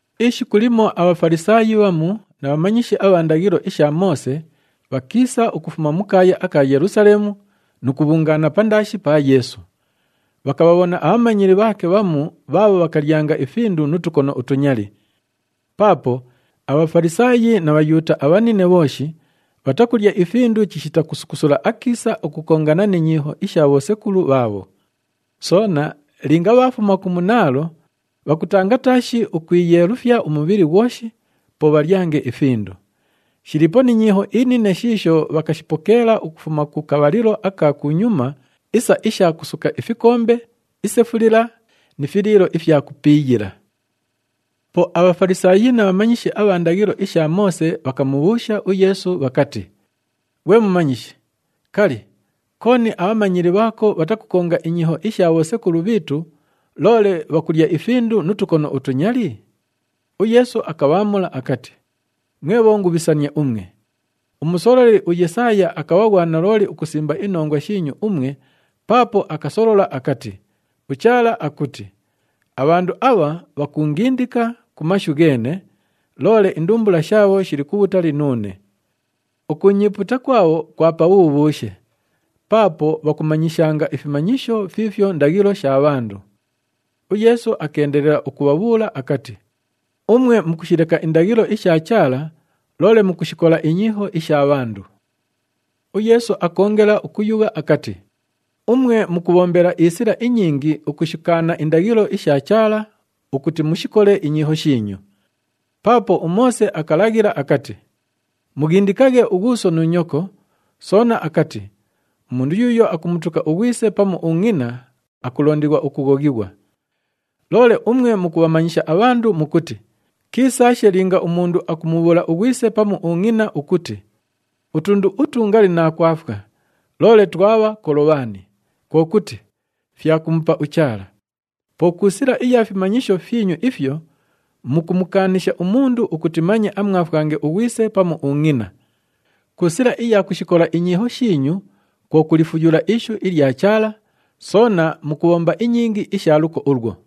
Ishiku limo aBhafalisaayi bhamu na bhamanyishi abha ndaghilo isha Moose bhakiisa ukufuma mu kaaya aka Yelusaleemu nu kubhungaana pandaashi pa Yeesu. Bhakabhabhona abhamanyili bhaake bhamu bhaabho bhakalyanga ifindu nu tukono utunyali. Paapo aBhafalisaayi na Bhayuuta abhanine bhooshi bhatakulya ifindu chishita kusukusula akiisa ukukongana ni nyiiho isha bhosekulu bhaabho. Soona linga bhaafuma ku munaalo, bhakutanga taashi ukwiyeelufya umubhili ghwoshi, po bhalyange ifindu. Shiliipo ni nyiiho inine shiisho bhakashipokeela ukufuma ku kabhalilo aka kunyuma isa isha kusuka ifikombe, isefulila ni filiilo ifya kupiiyila. Po aBhafalisaayi na bhamanyishi abha ndaghilo isha Moose bhakamubhuusha uYeesu bhakati, “Ghwe Mumanyishi, kali, kooni abhamanyili bhaako bhatakukonga inyiiho isha bhosekulu bhiitu, loole bhakulya ifindu nu tukono utunyali?” UYeesu akabhaamula akati, “Mwe bhongubhisania umwe! Umusololi uYesaaya akabha ghwa nalooli ukusimba inongwa shiinyu umwe paapo akasolola akati, uChaala akuti, ‘Abhandu abha bhakuungindika ku mashu gheene, loole indumbula shaabho shili kubhutali nuune. Ukuunyiipuuta kwabho kwa pabhubhuushe! Paapo bhakumanyishanga ifimanyisho fiifyo ndaghilo sha bhandu.’” UYeesu akeendelela ukubhabhuula akati, “Umwe mukushileka indaghilo isha Chaala, loole mukushikola inyiiho isha bhandu.” UYeesu akoongela ukuyugha akati, “Umwe mukubhombela isila inyingi ukushikaana indaghilo isha Chaala ukuti mushikole inyiiho shiinyu. Paapo uMoose akalaghila akati, ‘Mughindikaghe ughuuso nu nyoko,’ soona akati, ‘Umundu yuuyo akumutuka ughwise pamu ungʼina akulondighwa ukughoghighwa.’ Loole umwe mukubhamanyisha abhandu mukuti, kiisaashe linga umundu akumubhuula ughwise pamu ungʼina ukuti, ‘Utundu utu ngali naakwafwa, loole twabha Kolobhani,’ kwo kuti, ‘Fya kumupa uChaala.’ Po ku sila iya fimanyisho fyinyu ifyo, mukumukaanisha umundu ukuti manye amwafwange ughwise pamu ungʼina. Ku sila iya kushikola inyiiho shiinyu kwo kulifuyula ishu ilya Chaala, soona mukubhomba inyingi isha luko ulwo.”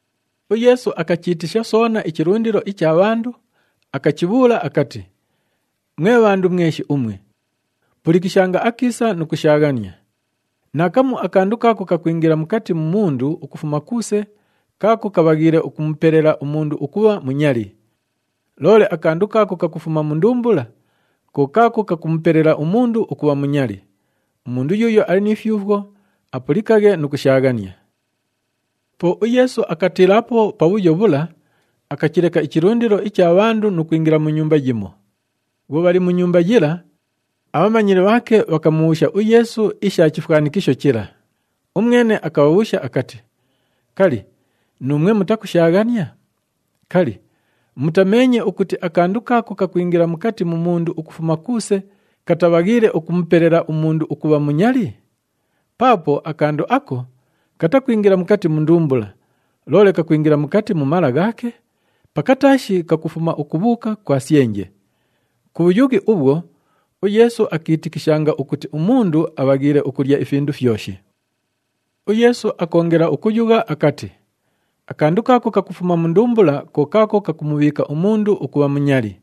UYeesu akachiitisha soona ichilundilo icha bhandu, akachibhuula akati, “Mwe bhandu mweshi umwe, pulikishanga akiisa nu kushaaghania. Naakamu akandu kaako kakwingila mukati mu mundu ukufuma kuuse kaako kabhaghiile ukumupelela umundu ukubha munyali. Loole akandu kaako kakufuma mu ndumbula, ko kaako kakumupelela umundu ukubha munyali. [ Umundu yuuyo ali ni fyufwo, apulikaghe nu kushaaghania.]” Po uYeesu akatiilaapo pabhuyo bhula, akachileka ichilundilo icha bhandu nu kwingila mu nyumba yimo. Bhwo bhali mu nyumba yila, abhamanyili bhaake bhakamubhuusha uYeesu isha chifwanikisho chila. Umwene akabhabhuusha akati, “Kali, nuumwe mutakushaaghania? Kali, mutameenye ukuti akandu kaako kakwingila mukati mu mundu ukufuma kuuse katabhaghiile ukumupelela umundu ukubha munyali? Paapo akandu ako, katakwingila mukati mu ndumbula, loole kakwingila mukati mu mala ghaake, pakataashi kakufuma ukubhuuka kwa syenje.” Ku bhuyughi ubhwo, uYeesu akiitikishanga ukuti umundu abhaghiile ukulya ifindu fyoshi. UYeesu akoongela ukuyugha akati, “Akandu kaako kakufuma mu ndumbula, ko kaako kakumubhiika umundu ukubha munyali.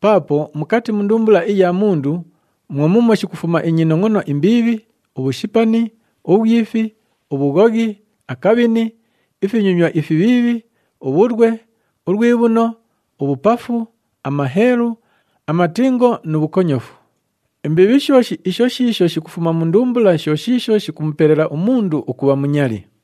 Paapo mukati mu ndumbula iya mundu mwo muumwo shikufuma inyinongʼono imbiibhi, ubhushipani, ubhwifi, ubhughoghi, akabhini, ifinyonywa ifibhiibhi, ubhulwe, ulwibhuno, ubhupafu, amaheelu, amatingo nu bhukonyofu. Imbiibhi shooshi isho shiisho shikufuma mu ndumbula sho shiisho shikumupelela umundu ukubha munyali.”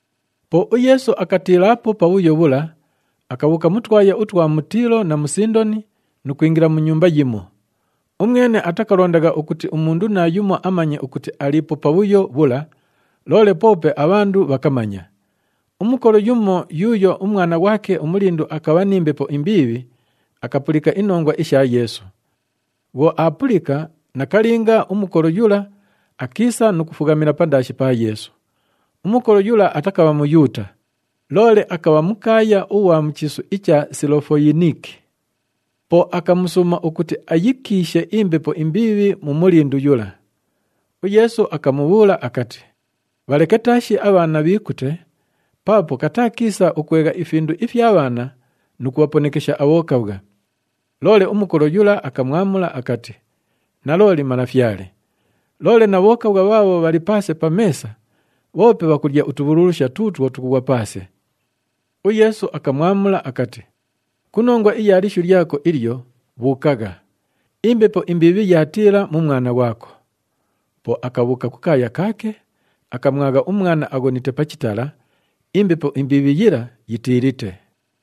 Po uYeesu akatiilaapo pabhuyo bhula, akabhuuka mu twaya utwa mu Tiilo na mu Sindoni nu kwingila mu nyumba yimo. Umwene atakalondagha ukuti umundu naayumo amanye ukuti aliipo pabhuyo bhula, loole poope abhandu bhakamanya. Umukolo yumo yuuyo umwana ghwake umulindu akabha ni mbepo imbiibhi, akapulika inongwa isha Yeesu. Bhwo aapulika, nakalinga, umukolo yula akiisa nu kufughamila pandaashi pa Yeesu. Umukolo yula atakabha Muyuuta, loole akabha mukaaya ughwa mu chiisu icha Silofoyiniki. Po akamusuuma ukuti ayikiishe imbepo imbiibhi mu mulindu yula. UYeesu akamubhuula akati, “Bhaleke taashi abhaana bhiikute, paapo kataa kiisa ukwegha ifindu ifya bhaana nu kubhaponekesha abhokabhwa.” Loole umukolo yula akamwamula akati, “Nalooli Malafyale, loole na bhokabhwa bhaabho bhali paase pa meesa, bhoope bhakulya utubhululusha tuutwo tukughwa paase.” UYeesu akamwamula akati, “Ku nongwa iya lishu lyako ilyo, bhuukagha. Imbepo imbiibhi yaatiila mu mwana ghwako.” Po akabhuuka kukaaya kaake, akamwagha umwana aghonite pa chitala, imbepo imbiibhi yila yitiilite.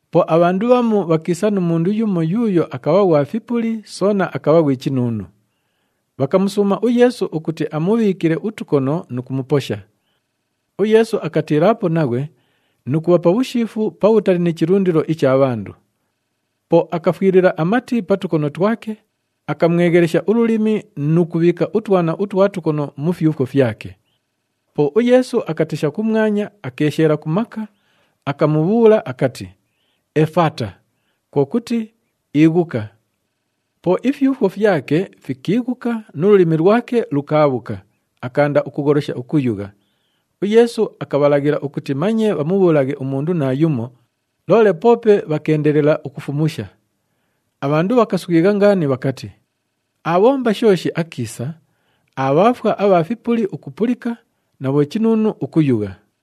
Po abhandu bhamu bhakiisa nu mundu yumo yuuyo akabha ghwa fipuli soona akabha ghwi chinuunu. Bhakamusuuma uYeesu ukuti amubhiikile utukono nu kumuposha. UYeesu akatiilaapo naghwe nu kubha pabhushiifu pabhutali ni chilundilo icha bhandu. Po akafwilila amati pa tukono twake, akamweghelesha ululimi nu kubhiika utwana utwa tukono mu fyufwo fyake. Po uYeesu akatesha kumwanya, akeesheela ku maka, akamubhuula akati, “Efata!” Kwo kuti, “Ighuka.” Po ifyufwo fyake fikiighuka nu lulimi lwake lukaabhuka, akaanda ukugholosha ukuyugha. UYeesu akabhalaghilila ukuti manye bhamubhuulaghe umundu naayumo, loole poope bhakeendelela ukufumusha. Abhandu bhakaswigha ngaani bhakati, “Aabhomba shooshi akiisa, aabhaafwa abha fipuli ukupulika na bhochinuunu ukuyugha.”